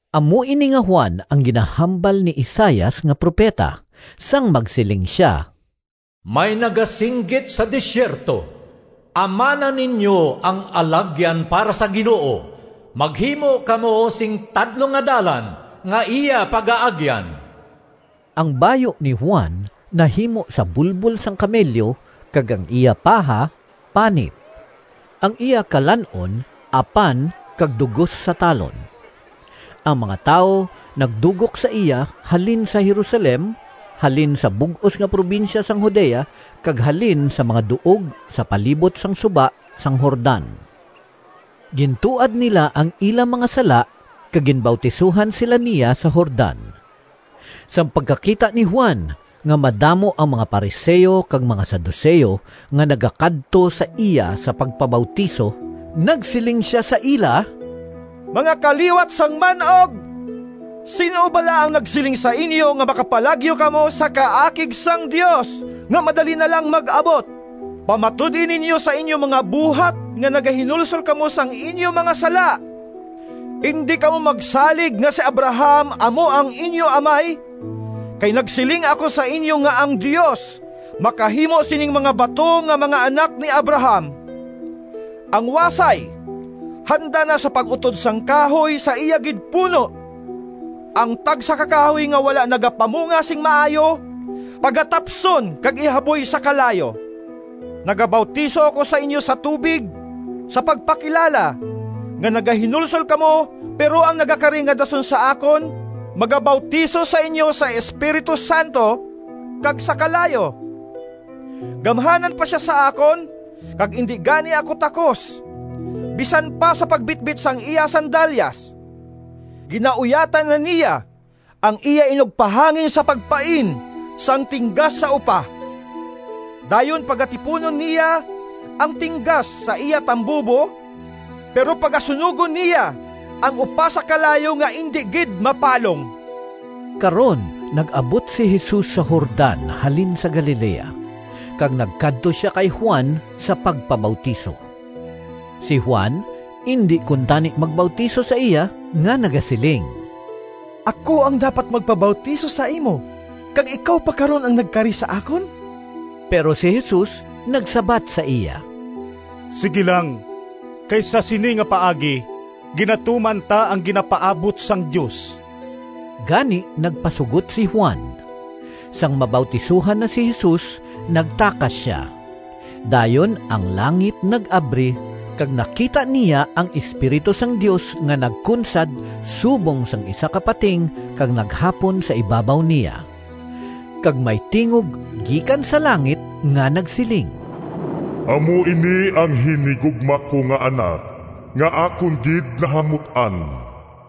Amo ini nga Juan ang ginahambal ni Isaias nga propeta sang magsiling sia: “May nagasinggit sa desierto, ‘Amana ninyo ang alagyan Para sa Ginoo, Maghimo kamo sing tadlong nga dalan Nga iya pagaagyan!’” Ang bayu ni Juan nahimo sa bulbol sang kamelyo, kag ang iya paha panit. Ang iya kalan-on apan kag dugos sa talon. Ang mga tawo nagdugok sa iya halin sa Jerusalem, halin sa bug-os nga probinsya sang Judea kag halin sa mga duog sa palibot sang suba sang Jordan. Gintuad nila ang ila mga sala kag ginbautisohan sila niya sa Jordan. Sang pagkakita ni Juan nga madamo ang mga Fariseo kag mga Saduceo nga nagakadto sa iya sa pagpabautiso, nagsiling sia sa ila, “Mga kaliwat sang man-og, sin-o bala ang nagsiling sa inyo nga makapalagyo kamo sa kaakig sang Dios nga madali na lang mag-abot? Pamatud-i ninyo sa inyo mga buhat nga nagahinulsol kamo sang inyo mga sala. Indi kamo magsalig nga si Abraham amo ang inyo amay, kay nagsiling ako sa inyo nga ang Dios makahimo sining mga bato nga mga anak ni Abraham! Ang wasay handa na sa pag-utod sang kahoy sa iya gid puno. Ang tagsa ka kahoy nga wala nagapamunga sing maayo pagatapson kag ihaboy sa kalayo. Nagabautiso ako sa inyo sa tubig sa pagpakilala nga nagahinulsol kamo, pero ang nagakari nga dason sa akon magabautiso sa inyo sa Espiritu Santo kag sa kalayo. Gamhanan pa sia sa akon, kag indi gani ako takos bisan pa sa pagbitbit sang iya sandalyas. Ginauyatan na niya ang iya inugpahangin sa pagpain sang tinggas sa upa; dayon pagatipunon niya ang tinggas sa iya tambubo, pero pagasunogon niya ang upa sa kalayo nga indi gid mapalong!” Karon nag-abot si Jesus sa Jordan halin sa Galilea, kag nagkadto sia kay Juan sa pagpabautiso. Si Juan indi kuntani magbautiso sa iya nga nagasiling, “Ako ang dapat magpabautiso sa imo, kag ikaw pa karon ang nagkari sa akon!” Pero si Jesus nagsabat sa iya, “Sigi lang. Kay sa sini nga paagi ginatuman ta ang ginapaabot sang Dios.” Gani nagpasugot si Juan. Sang mabautisohan na si Jesus, nagtakas sia. Dayon ang langit nag-abri kag nakita niya ang Espiritu sang Dios nga nagkunsad subong sang isa ka pating kag naghapon sa ibabaw niya. Kag may tingog gikan sa langit nga nagsiling, “Amo ini ang hinigugma ko nga Anak, nga akon gid nahamut-an.”